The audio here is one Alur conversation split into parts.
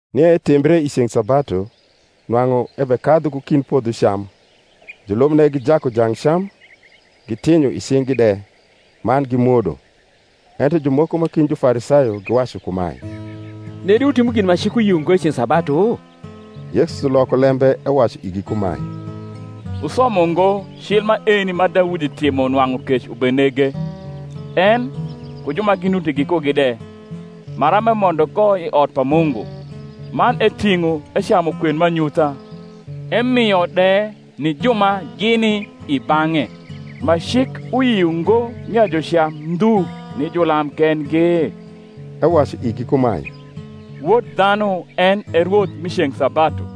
Nie etimbre i ceng’ sabatu, nwang’u ebekadhu ku kind podho cam, julubne gijaku jang cam, gitinyo i cing’gi de, man gimwodo. Ento jumoko ma kind Jufarisayo giwacu kumae, Nedi wutimo gin ma cik uyio ngo i ceng’ sabatu? Yesu loko lembe ewacu igi kumae, Wusomo ngo cil maeni ma Daudi timo nwang’u kec ubenege, en, ku ju ma ginuti gikugi de; maram emondo ko i ot pa Mungu, man eting’o ecamu kwen m’anyutha, emio de ni ju ma gini i bang’e; ma cik uyio ngo nia jucam ndhu ni julam kengi? Ewacu igi kumae, Wod dhanu en e rwoth mi ceng’ sabatu.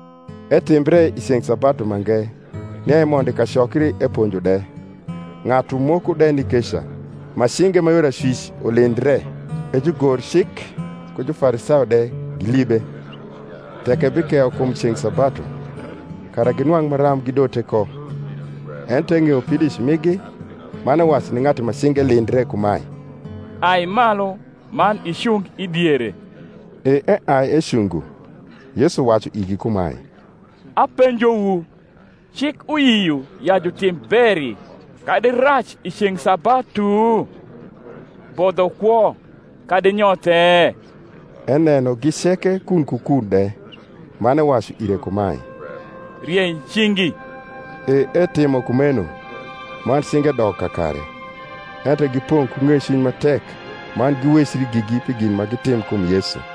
Etimbre i ceng’ sabatu mange, nia emondo i kacokri eponjo de: ng’atu moko de ni keca, ma cinge ma yor acwic ulindre. E jugorcik ku Jufarisayo de gilibe, tek ebikeyo kum ceng’ sabatu; kara ginwang’ maram gidote ko. Ento eng’eyo pidoic migi; man ewacu ni ng’atu ma cinge lindre kumae, Ai malu, man icung i diere. E eai ecungo. Yesu wacu igi kumae, Apenjowu, Cik uyio ya jutim beri, kadi rac i ceng’ sabatu? bodho kwo, kadi nyothe? Enenogi ceke kun ku kun de, man ewacu ire kumae, Riei cingi. E etimo kumeno: man cinge dok kakare. Ento gipong’ ku ng’ecwiny ma tek man giwecri gigi pi gin ma gitim kum Yesu.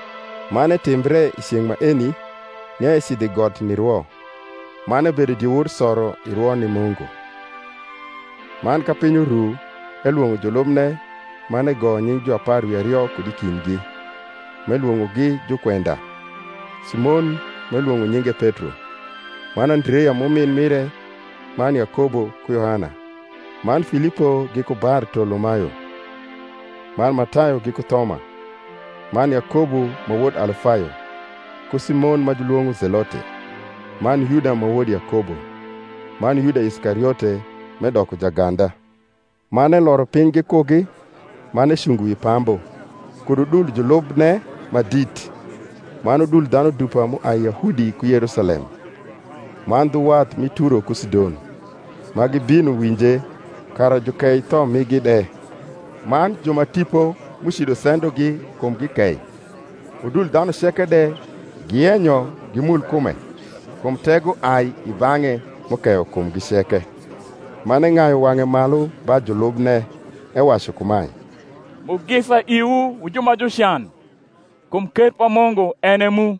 Man etimbre i ceng’ maeni, nia ecidho i got nirwo; man ebedo diewor soro i rwo ni Mungu. Man ka piny uru, elwong’o julubne; man egoyo nying’ juapar wi ario kud i kindgi, m’elwong’ogi jukwenda: Simon, m’elwong’o nyinge Petro, man Andrea m’umin mire, man Yakobo ku Yohana, man Filipo giku Bartolomayo, man Matayo giku Thoma, man Yakobo ma wod Alfayo, ku Simon ma julwong’o Zelote, man Yuda ma wod Yakobo, man Yuda Iskariote, m’edoko jaganda. Man eloro piny gikugi, man ecungo wi pambu, kud udul julubne ma dit, man udul dhanu dupa m’uai i Yahudi ku Yerusalem, man dhu wath mi Turo ku Sidon, ma gibino winje, kara jukei tho migi de; man ju ma tipo m’ucido sendogi kumgi kei. Udul dhanu ceke de giyenyo gimul kume; kum tego ai i bang’e m’ukeyo kumgi ceke. Man eng’ayu wang’e malu ba julubne, ewacu kumae, Mugisa iwu wu ju ma jucan: kum ker pa Mungu en e mu.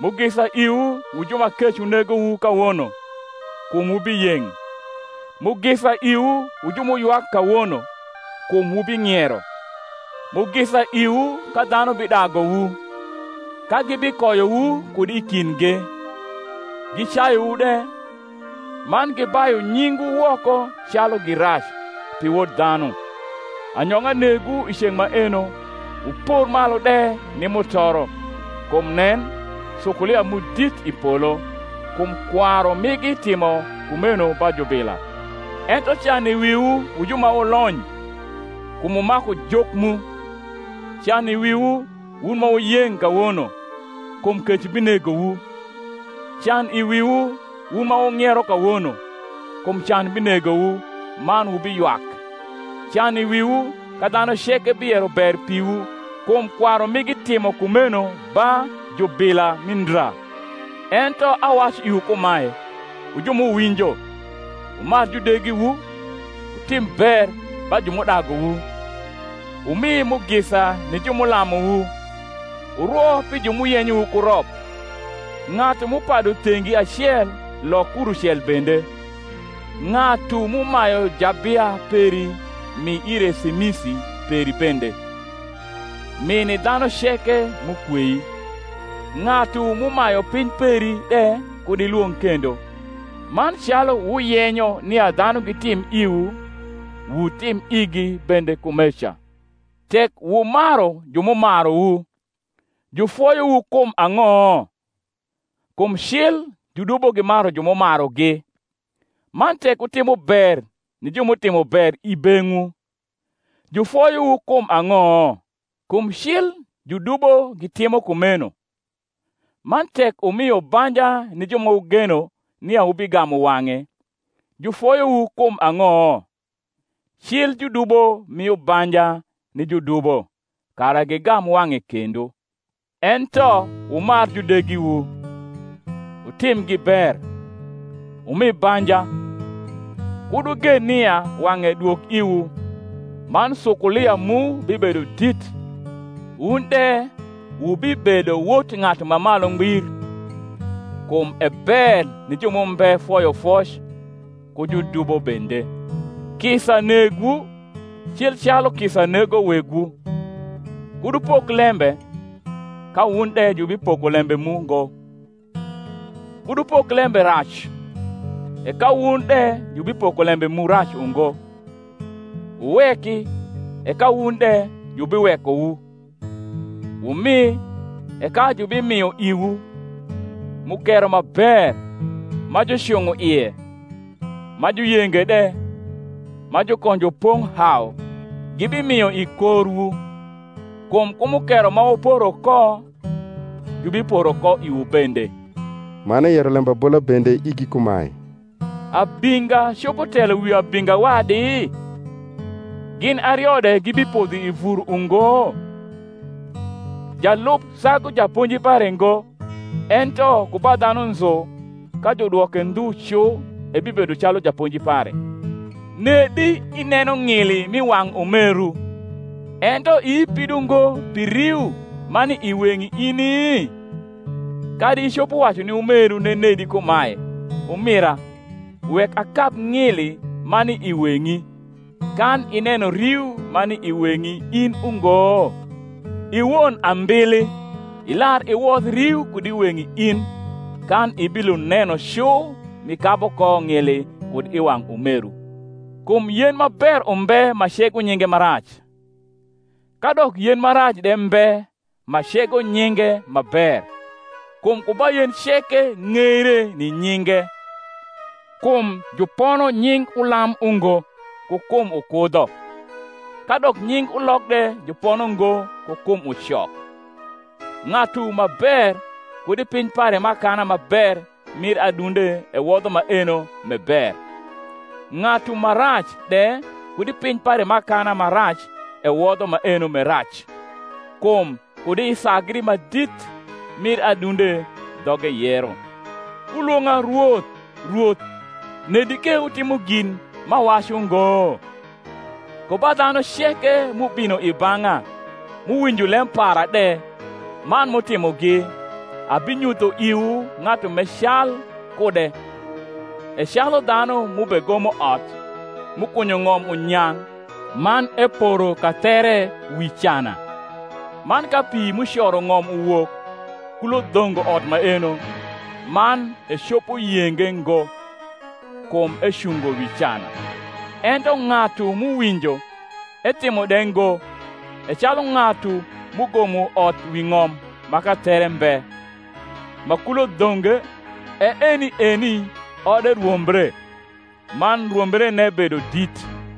Mugisa iwu wu ju ma kec unegowu kawono: kum wubiyeng’. Mugisa iwu wu ju m’uywak kawono: kum wubing’iero. Mugisa iwu, ka dhanu bidaguwu, ka gibikoyowu kud i kindgi, gicayuwu de, man gibayu nyingwu woko calu gi rac, pi Wod dhanu. Anyong’a negwu i ceng’ maeno, wupor malu de ni mutoro: kum nen, sukulia mu dit i polo; kum kwaru migi timo kumeno ba jubila. Ento can i wiwu wu ju ma wulony! kum wumaku juk mu. Can i wiwu, wun ma wuyeng’ kawono! kum kec binegowu. Can i wiwu, wun ma wung’iero kawono! kum can binegowu man wubiywak. Can i wiwu, ka dhanu ceke biyero ber piwu! kum kwaru migi timo kumeno ba jubila mi ndra. Ento awacu iwu kumae, wu ju m’uwinjo, Wumar judegiwu, wutim ber ba ju m’udaguwu, wumi mugisa ni ju m’ulamuwu, wurwo pi ju m’uyenyowu ku rop. Ng’atu m’upadu thengi acel lok kurucel bende; ng’atu m’umayu jabia peri mi ire semisi peri bende. Mi ni dhanu ceke m’ukwei; ng’atu m’umayu piny peri de kud ilwong’ kendo. Man calu wuyenyo nia dhanu gitim iwu, wutim igi bende kumeca. Tek wumaru ju m’umaruwu, jufoyowu kum ang’o? kum cil judubo gimaru ju m’umarugi. Man tek wutimo ber ni ju m’utimo ber i beng’wu, jufoyowu kum ang’o? kum cil judubo gitimo kumeno. Man tek wumio banja ni ju ma wugeno nia wubigamu wang’e, jufoyowu kum ang’o? cil judubo mio banja ni judubo, kara gigam wang’e kendo. Ento wumar judegiwu, wutimgi ber, wumi banja, kud wugen nia wang’e dwog iwu; man sukulia mu bibedo dit, wun de wubibedo wot Ng’atu ma Malu Ngbir: kum e ber ni ju m’umbe foyofoc ku judubo bende. Kisa negwu, cil calu kisa nego Wegwu. Kud wupok lembe, ka wun de jubipoko lembe mu ngo: kud wupok lembe rac, e ka wun de jubipoko lembe mu rac ungo: wuweki, e ka wun de jubiwekowu: wumi, e ka jubimio iwu; mukero ma ber, ma jucung’o ie, ma juyenge de, ma jukonjo pong’ hau, gibimio i korwu. Kum ku mukero ma wuporo ko juhiporo ko iwu bende. Man eyero lembabola bende igi kumae, Abinga copo telo wi abinga wadi? gin ario de gibipodho i vur ungo? Jalub sagu japonji pare ngo: ento ku ba dhanu nzu ka judwoke ndhu cu ebibedo calu japonji pare. Nedi ineno ng’ili m’i wang’ umeru, ento ii pido ngo pi riu ma ni i weng’i ini? Kadi icopo wacu ni umeru nenedi kumae, Umira, wek akab ng’ili ma ni i weng’i, kan ineno riu ma ni i weng’i in ungo? I won ambili, ilar iwodh riu kud i weng’i in, kan ibilund neno cu m’ikabu ko ng’ili kud i wang’ umeru. Kum yen ma ber umbe ma cego nyinge ma rac; kadok yen ma rac de mbe ma cego nyinge ma ber. Kum ku ba yen ceke ng’eire ni nyinge. Kum jupono nying ulam ungo ku kum ukudho, kadok nying ulok de jupono ngo ku kum ucok. Ng’atu ma ber kud i piny pare m’akana ma ber mir adunde ewodho maeno m’e ber; ng’atu ma rac de kud i piny pare m’akana ma rac ewodho maeno m’e rac: kum kud i sagri ma dit mir adunde dhoge yero. Wulwong’a Rwoth, Rwoth, nedi ke wutimo gin m’awacu ngo? Ku ba dhanu ceke m’ubino i bang’a, m’uwinjo lem para de, man m’utimogi, abinyutho iwu ng’atu m’e cal kude: e calu dhanu m’ubegomo ot, m’ukunyo ng’om unyang’, man eporo kathere wi cana: man ka pi m’ucoro ng’om uwok, kulo dhongo ot maeno, man ecopo yenge ngo: kum ecungo wi cana. Ento ng’atu m’uwinjo, etimo de ngo, e calu ng’atu m’ugomo ot wi ng’om ma kathere mbe; ma kulo dhonge, e eni eni ode rwombre; man rwombrene bedo dit.